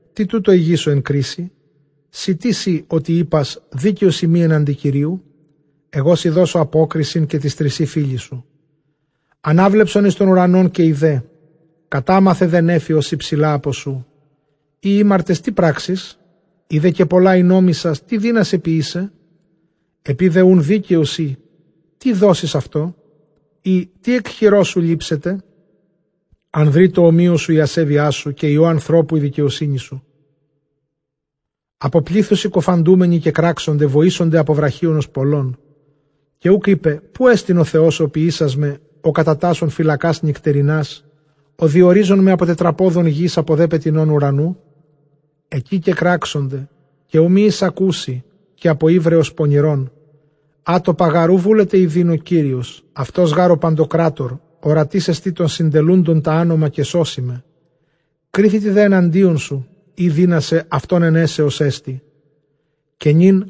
Τί τοῦτο ἡγήσω ἐν κρίσει; σὺ τίς εἶ, ὅτι εἶπας, δίκαιός εἰμι ἔναντι Κυρίου; Ἐγώ σοι δώσω ἀπόκρισιν, καὶ τοῖς τρισὶ φίλοις σου. Ἀνάβλεψον εἰς τὸν οὐρανὸν, καὶ ἴδε· κατάμαθε δὲ νέφη, ὡς ὑψηλὰ ἀπὸ σοῦ. Εἰ ἥμαρτες, τί πράξεις; εἰ δὲ καὶ πολλὰ ἠνόμησας, τί δύνασαι ποιῆσαι; Ἐπεὶ δὲ οὖν δίκαιος εἶ, τί δώσεις αὐτῷ; ἢ τί ἐκ χειρός σου λήψεται; Ἀνδρὶ τῷ ὁμοίῳ σου ἡ ἀσέβειά σου, καὶ υἱῷ ἀνθρώπου ἡ δικαιοσύνη σου. Ἀπὸ πλήθους συκοφαντούμενοι κεκράξονται, βοήσονται ἀπὸ βραχίονος πολλῶν. Καὶ οὐκ εἶπε, ποῦ ἐστιν ὁ Θεὸς ὁ ποιήσας με, ὁ κατατάσσων φυλακὰς νυκτερινὰς, ὁ διορίζων με ἀπὸ τετραπόδων γῆς, ἀπὸ δὲ πετεινῶν οὐρανοῦ; Ἐκεῖ κεκράξονται, καὶ οὐ μὴ εἰσακούσῃ, καὶ ἀπὸ ὕβρεως πονηρῶν. Ἄτοπα γὰρ οὐ βούλεται ἰδεῖν ὁ Κύριος, αὐτὸς γὰρ ὁ παντοκράτωρ. Ὁρατής ἐστι τῶν συντελούντων τὰ ἄνομα, καὶ σώσει με· κρίθητι δὲ ἐναντίον αὐτοῦ, εἰ δύνασαι αὐτὸν αἰνέσαι, ὡς ἔστι καὶ νῦν.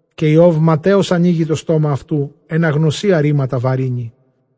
καὶ Ἰὼβ ματαίως ἀνοίγει τὸ στόμα αὐτοῦ, ἐν ἀγνωσίᾳ ῥήματα βαρύνει.